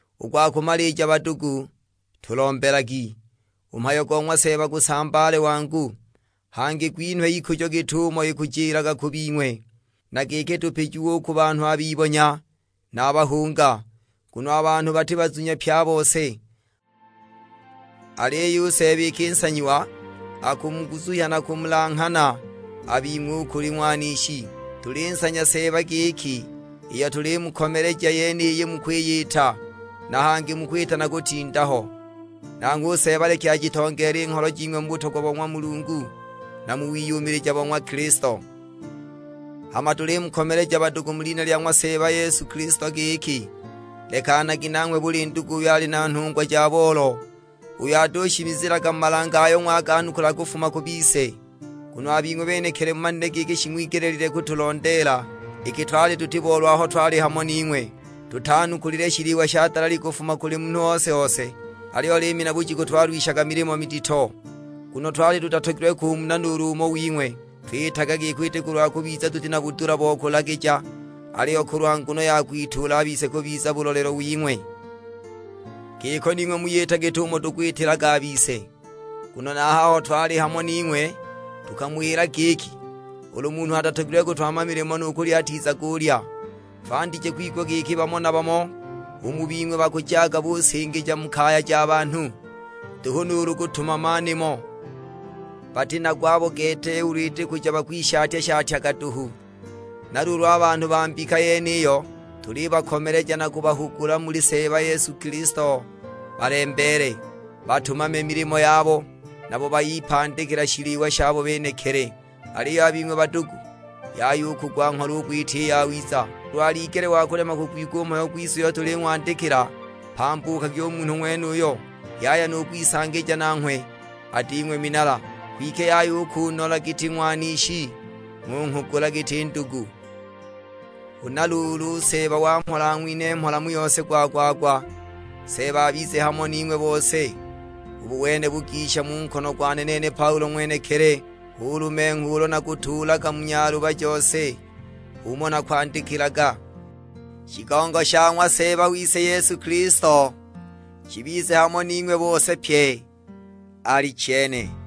U gwa kumalija badugu, tulombelagi, u mhayo go ng'wa Seeba gusambaale wangu, hangi gwinhwe ikujo git'umo ikujilaga ku bing'we. Na giki tupijiwe u ku banhu a bibonya na a bahunga; nguno a banhu bati bazunya pye a bose. Aliyo u Seeba iki nsanyiwa, akumuguzuhya na kumulanghana a bing'we u kuli ng'wanishi. Tulinsanya Seeba giki iyo tulimukomeleja yeniyi mukwiyita, na hangi mukwita na kutinda ho. Nanghwe u Seeba leki ajitongeele i ngholo jing'we mu butogwa bo ng'wa Mulungu na mu wiyumilija bo ng'wa Kilisto. Hama tulimukomeleja badugu mu lina lya ng'wa Seeba Yesu Kilisto giki, lekanagi nanghwe buli ndugu uyo ali na nhungwa ja boolo, uyo atushimizilaga mu malange ayo ng'waganukula kufuma ku bise. Nguno a bing'we benekili mumanile giki shing'wigelile kutulondeela, iki twali tuti boolo aho twali hamo ning'we. Tutanukulile shiliwa sha dalali kufuma kuli munhu ose-ose, aliyo liimi na bujiku twalwishaga milimo midito, nguno twali tutatogilwe kumuna nuulu umo wing'we. Twitaga giko iti kulwa kubiza tuti na budula bo kulagija, aliyo kulwa nguno ya kwituula a bise kubiza bulolelo wing'we, giki ning'we muyita git'umo tukwitilaga a bise. Nguno na a haho twali hamo ning'we tukamuwila giki, ulu munhu atatogilwe kutumama milimo, nu kulya atizagulya! Twandije kwigwa giki bamo na bamo u mu bing'we bakujaga busingija mu kaya ja banhu, nduhu nuulu kutumama nimo; bati na gwabo gete ulu iti kuja bakwishatya-shatyaga duhu! Na luulu a banhu ba mbika yeniyo tulibakomeleja na kubahugula muli Seeba Yesu Kilisto balembeele, batumame milimo yabo; nabo bayipandikila shiliwa shabo benekili. Aliyo a bing'we badugu, yaya u kugwa ngholo u kwita i yawiza. Ulu aligele wa kulema kugwigwa u mhayo gwise uyo tuling'wandikila, mpambukagi u munhu ng'wenuyo, yaya nu kwisangija nanghwe, ading'we minala. Kwike yaya u kunola giti ng'wanishi, ng'unghugula giti ndugu. Huna luulu u Seeba wa mhola ang'winhe mhola mu yose gwa-gwa-gwa. Seeba abize hamo ning'we bose. Ubu wene bugisha mu nkono gwane nene Paulo ng'wenekili, hu lumengho ulo nakutuulaga mu nyaluba jose; h'umo nakwandikilaga. Shigongo sha ng'wa Seeba wise Yesu Kilisto shibize hamo ning'we bose pye: Alichene.